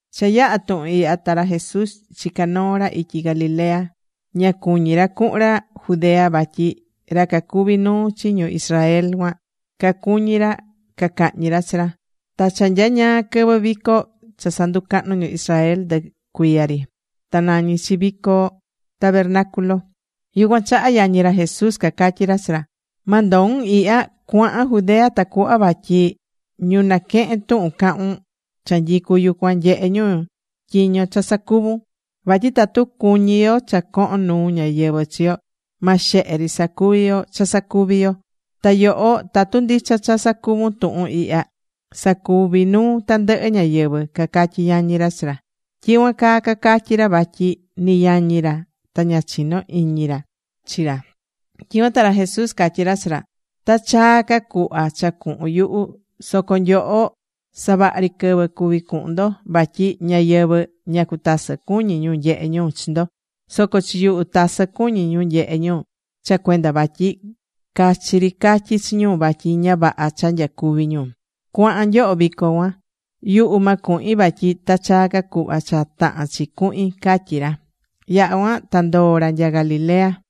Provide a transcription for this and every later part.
Cha yaha̱ tuhun ihya, ta ra Jesús chicá noo ra ityi Galilea. Ña cuñí ra cuhun ra Judea vatyi ra cacuví nuu chi ñu Israel cuan cacuñí ra cacahñi ra chi ra. Ta cha nyañaa quɨvɨ vico cha sanducahnu ñu Israel ndɨ cuiya ri. Ta nañí chi vico Tabernáculo. Yucuan chaha yañi ra Jesús cacatyí ra chi ra: ―Ma ndoun ihya. Cua̱han Judea tacuhva vatyi ñu naquehén tuhun cahún cha nyicú yucuan nyehe ñu tyiño cha sacuvún. Vatyi tatu cuñí yo cha cohon nuu ñáyɨvɨ chi yo, ma xehe ri sacuví yo cha sacuví yo. Ta yoho tatu ndicha cha sacuvún tuhun ihya, sa̱cuvi nuu tandɨhɨ ñáyɨvɨ ―cacatyí yañi ra chi ra. Tyicuan caa cacatyí ra vatyi ni yañi ra ta ña chinó iñi ra chi ra. Tyicuan ta ra Jesús catyí ra chi ra: ―Ta chaa ca cuhva cha cuhun yuhu. Soco nyoho savahri quɨvɨ cuví cuhun ndo. Vatyi ñáyɨvɨ ña cutasɨ cuñí ñu nyehé ñu chi ndo, soco chi yuhu tasɨ cuñí ñu nyehé ñu cha cuenda vatyi cachi ri catyi chi ñu vatyi ña vaha cha nyacuví ñu. Cua̱han nyoho vico cuan. Yuhu ma cuhin vatyi ta chaa ca cuhva cha tahán chi cuhin ―catyí ra. Yaha̱ cuan ta ndoo̱ ra nya Galilea.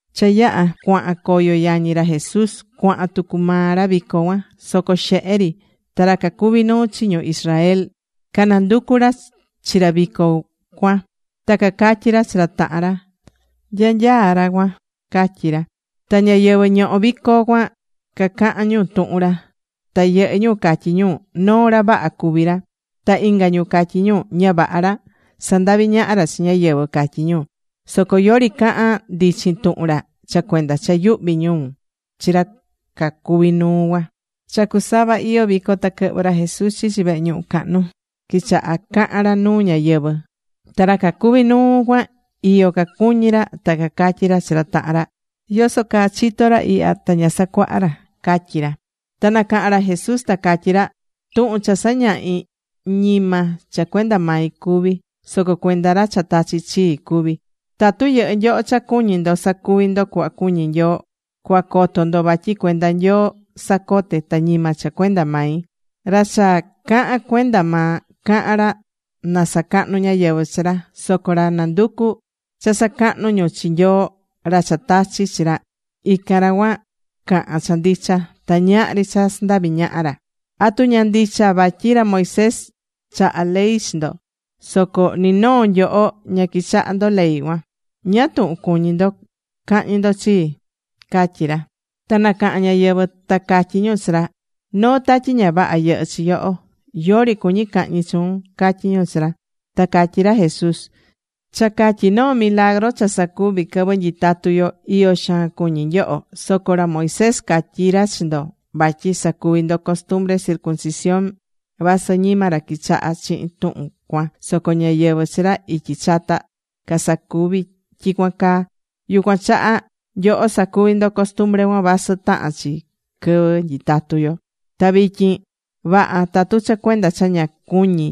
Cha yaha̱ cuahan coyo yañi ra Jesús, cuahan tucu maa ra vico cuan, soco xehe ri. Ta ra cacuví nuu chi ñu Israel cananducú ra chi ra vico cuan, ta cacatyí ra chi ra tahan ra: ―¿Nya nyaá ra cuan? ―catyí ra. Ta ñáyɨvɨ ñohó vico cuan cacahán ñu tuhun ra. Ta yɨhɨ́ ñu catyí ñu: “Noo ra vaha cuví ra.” Ta inga ñu catyí ñu: “Ña vaha ra, sandaví ñaha ra chi ñáyɨvɨ”, catyí ñu. Soco yori cahán ndichin tuhun ra cha cuenda cha yuhví ñu chi ra cacuví nuu cuan. Cha cusava iyó vico ta quɨhvɨ̱ ra Jesús chichi vehe ñuhu cahnu quichaha̱ cahan ra nuu ñáyɨvɨ. Ta ra cacuví nuu cuan iyó cacuñí ra ta cacatyí ra chi ra tahan ra: ―¿Yoso caa chitó ra ihya ta ña sacuaha̱ ra? ―catyí ra. Ta nacaha̱n ra Jesús ta catyí ra: ―Tuhun cha sañahí, ñima cha cuenda mai cuví, soco cuenda ra cha tachi̱ chii cuví. Tatu yɨhɨ́ nyoho cha cuñí ndo sacuvi ndo cuhva cuñí Nyoo, cua coto ndo vatyi cuenda Nyoo sacote ta ñima cha cuenda mai. Ra cha cahán cuenda maa, cahán ra na sacahnu ñáyɨvɨ chi ra. Soco ra nanducú cha sacahnu ñu chi Nyoo, ra cha tachi̱ chi ra, ican ra cuan cahán cha ndicha. Ta ñahri cha sandaví ñaha ra. ’¿Atu ña ndicha vatyi ra Moisés chaha̱ ley chi ndo? Soco ni noo nyoho ña quichahá ndo ley cuan. ¿Ñáá tuhun cuñí ndo cahñi ndo chii? ―catyí ra. Ta nacaha̱n ñáyɨvɨ ta catyí ñu chi ra: ―Noo tatyi ña vaha yɨhɨ́ chi yoho. Yori cuñí cahñi chuun ―catyí ñu chi ra. Ta catyí ra Jesús: ―Cha catyi noo milagru cha sacuvi̱ quɨvɨ nyitatu yo, iyo xaan cuñí nyoho. Soco ra Moisés catyí ra chi ndo vatyi sacuvi ndo costumbre circuncisión. Vasɨ ñima ra quichaha̱ chihin tuhun cuan, soco ñáyɨvɨ chi ra ityi chata, casacuvi tyicuan caa. Yucuan chaha nyoho sacuví ndo costumbre cuan vasɨ tahán chi quɨvɨ nyitatu yo. Ta vityin, vaha tatu cha cuenda cha ña cuñí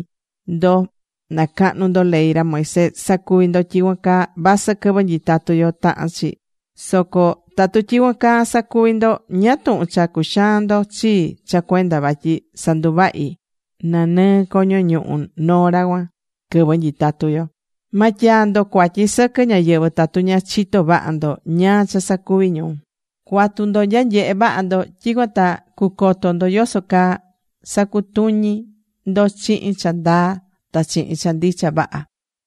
ndo nacahnu ndo ley ra Moisés sacuvi ndo tyicuan caa vasɨ quɨvɨ nyitatu yo tahán chi. Soco tatu tyicuan caa sacuvi ndo, ¿ñáá tuhun cha cuxaan ndo chii cha cuenda vatyi sanduvahi̱ nanɨɨ coño ñuhu noo ra cuan quɨvɨ nyitatu yo? Ma tyaa ndo cuatyi sɨquɨ ñáyɨvɨ tatu ña chitó vaha ndo ñáá cha sacuvi ñu. Cua̱tu ndo nya nyehe vaha ndo, tyicuan ta cucoto ndo yoso caa sacutuñi ndo chihin cha ndaa ta chihin cha ndicha vaha.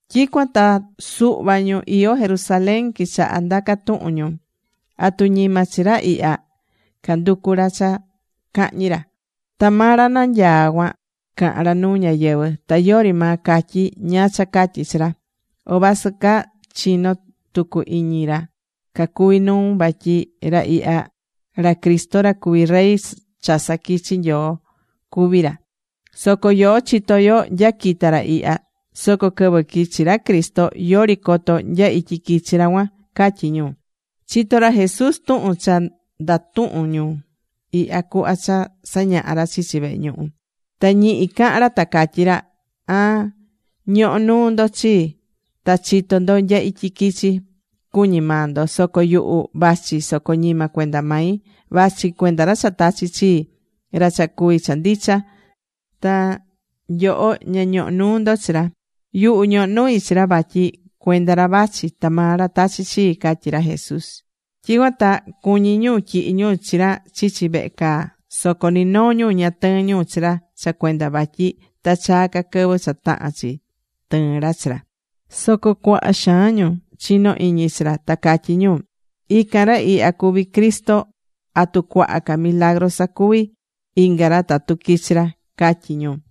Tyicuan ta suhva ñu iyó Jerusalén, quichaha̱ ndaca tuhun ñu: ―¿Atu ñima chi ra ihya canducu ra cha cahñi ra? Ta maa ra nanyaá cuan cahán ra nuu ñáyɨvɨ. Ta yori maa catyi ñáá cha catyí chi ra. ¿O vasɨ ca chinó tucu iñi ra cacuví nuu vatyi ra ihya ra Cristo ra cuvi rey cha saquichi Nyoo cuví ra? Soco yoó chitó yo nya quita̱ ra ihya. Soco quɨvɨ quichi ra Cristo yori coto nya ityi quichi ra cuan ―catyí ñu. Chitó ra Jesús tuhun cha ndatuhún ñu ihya cuhva cha sañahá ra chichi vehe ñuhu. Ta ñihi cahán ra ta catyí ra: ―¡An ñohó nuu ndo chii ta chitó ndo nya ityi quichi, cuñi maa ndo! Soco yuhu vachí soco ñima cuenda mai. Vachí cuenda ra cha tachi̱ chii, ra cha cuví cha ndicha. Ta nyoho ña ñohó nuu ndo chi ra. Yuhu ñohó nui chi ra vatyi cuenda ra vachi, ta maa ra tachi̱ chii ―catyí ra Jesús. Tyicuan ta cuñí ñu tyihi ñu chi ra chichi vehe caa. Soco ni noo ñu ña tɨɨ̱n ñu chi ra cha cuenda vatyi ta chaa ca quɨvɨ cha tahán chi tɨɨn ra chi ra. Soco cuaha xaan ñu chinó iñi chi ra. Ta catyí ñu: ―Ican ra ihya cuví Cristo. ¿Atu cuaha ca milagru sacuvi inga ra tatu quichi ra? ―catyi ñu.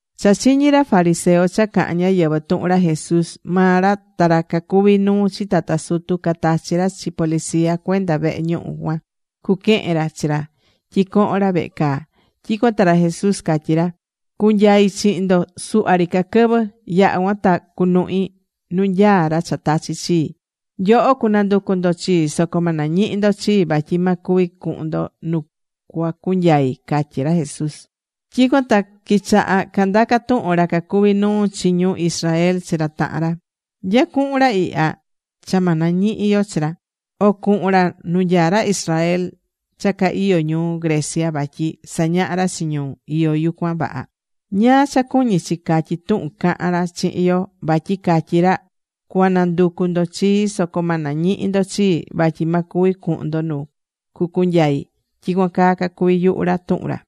Cha chiñi̱ ra fariseo cha cahán ñáyɨvɨ tuhun ra Jesús, maa ra ta ra cacuví nuu chi tata sutu catachi̱ ra chi policía cuenda vehe ñuhu cuan cuquehen ra chi ra tyi cohon ra vehe caa. Tyicuan ta ra Jesús catyí ra: ―Cunyai chihin ndo suhva ri ca quɨvɨ. Yaha̱ cuan ta cunuhi nu nyaá ra cha tachi̱ chii. Nyoho cunanducu ndo chii. Soco ma nañihi ndo chii. Vatyi ma cuvi cuhun ndo nu cuacunyai ―catyí ra Jesús. Tyicuan ta quichaha candaca tuhun ra cacuví nuu chi ñu Israel chi ra tahan ra: ―¿Nya cuhun ra ihya cha ma nañihi yo chi ra? ¿O cuhun ra nu nyaa ra Israel cha ca iyó ñuu Grecia vatyi sañaha ra chi ñu iyó yucuan, vaha? ¿Ñáá cha cuñí chi catyi tuhun cahan ra chihin yo? Vatyi catyi ra: “Cuananducu ndo chii soco ma nañihi ndo chii. Vatyi ma cuvi cuhun ndo nu cucunyai” ―tyicuan caa cacuví yuhu ra tuhun ra.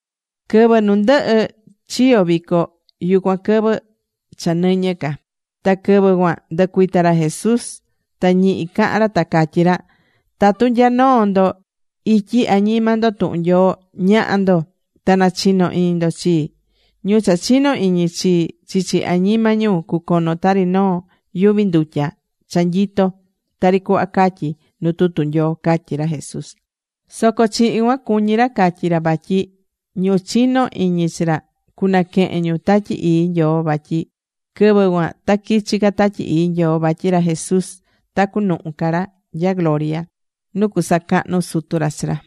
Quɨvɨ nu ndɨhɨ chiyo vico, yucuan quɨvɨ cha nɨñɨ ca. Ta quɨvɨ cuan ndɨcuita̱ ra Jesús ta ñihi cahán ra ta catyí ra: ―Tatu nya noo ndo ityi añima ndo tuhun Nyoo, ña̱ha ndo ta na̱chino iñi ndo chii. Ñu cha chinó iñi chii, chichi añima ñu cucono tari noo yuvi ndutya cha nyitó, tari cuhva catyí nu tutu Nyoo ―catyí ra Jesús. Soco chihin cuan cuñí ra catyi ra vatyi ñu chinó iñi chi ra cunaquehen ñu Tatyi Ii Nyoo, vatyi quɨvɨ cuan ta quichi ca Tatyi Ii Nyoo vatyi ra Jesús, ta cunuhu ca ra nya gloria nu cusacahnu Sutu ra chi ra.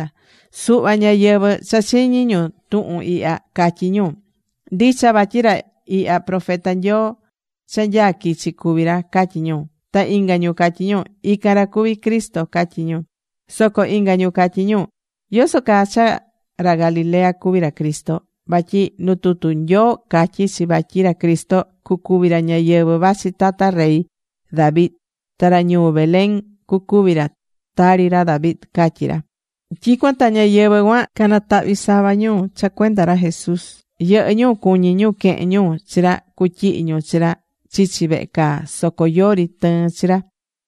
Suhva ñáyɨvɨ cha chiñi̱ ñu tuhun ihya, catyí ñu: ―Ndicha vatyi ra ihya profeta Nyoo cha nyaá quichi cuví ra ―catyí ñu. Ta inga ñu catyí ñu: ―Ican ra cuví Cristo ―catyí ñu. Soco inga ñu catyí ñu: ―¿Yoso caa cha ra Galilea cuví ra Cristo? Vatyi nu tutu Nyoo catyí chi vatyi ra Cristo cucuvi ra ñáyɨvɨ vachi tata rey David ta ra ñuu Belén cucuvi ra tari ra David ―catyí ñu. Tyicuan ta ñáyɨvɨ cuan canatahvi̱ sava ñu cha cuenda ra Jesús. Yɨhɨ́ ñu cuñí ñu quehen ñu chi ra cutyihi ñu chi ra chichi vehe caa. Soco yori tɨɨ̱n chi ra.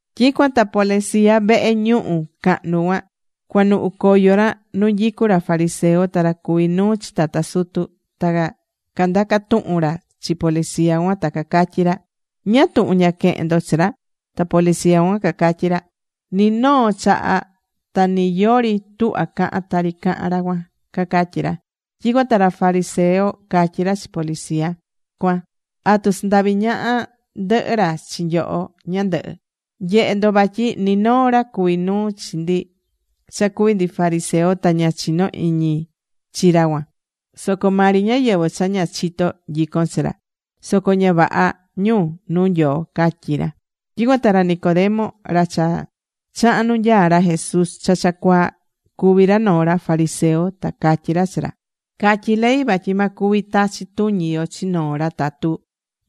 Tyicuan ta policía vehe ñuhu cahnu cuan, cuanuhu coyo ra nu nyicú ra fariseo ta ra cuví nuu chi tata sutu. Ta candaca̱ tuhun ra chi policía cuan ta cacatyí ra: ―¿Ñáá tuhun ña quehe̱n ndo chi ra? Ta policía cuan cacatyí ra: ―¡Ni noo chaha ta ni yori tuhva cahan tari cahán ra cuan! ―cacatyí ra. Tyicuan ta ra fariseo catyí ra chi policia cuan: ―¿Atu sandaví ñaha ndɨhɨ ra chi nyoho ñandɨhɨ? ¿Nye̱he ndo vatyi ni noo ra cuví nuu chi ndi cha cuví ndi fariseo ta ña chinó iñi chi ra cuan? Soco maa ri ñáyɨvɨ cha ña chitó nyicón chi ra. Soco ña vaha ñu nuu Nyoo ―catyí ra. Tyicuan ta ra Nicodemo, ra cha chaha̱n nu nyaá ra Jesús cha cha cuaa, cuví ra noo ra fariseo, ta catyí ra chi ra: ―Catyí ley vatyi ma cuvi tachi tuñi yo chi noo ra tatu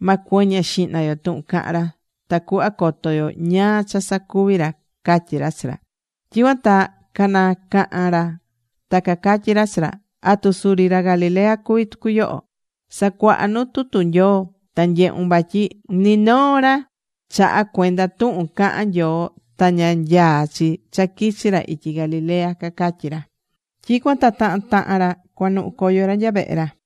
ma cuɨñɨ xihna yo tuhun cahan ra, tacuhva coto yo ñáá cha sacuvi̱ ra ―catyí ra chi ra. Tyicuan ta canacaha̱n ra ta cacatyí ra chi ra: ―¿Atu suri ra Galilea cuví tucu yoho? Sa̱cuaha nu tutu Nyoo ta nye̱hun, vatyi ni noo ra chahá cuenda tuhun cahán Nyoo ta ña nyaá chi cha quichi ra ityi Galilea ―cacatyí ra. Tyicuan ta tahan tahan ra cuanuhu coyo ra vehe ra.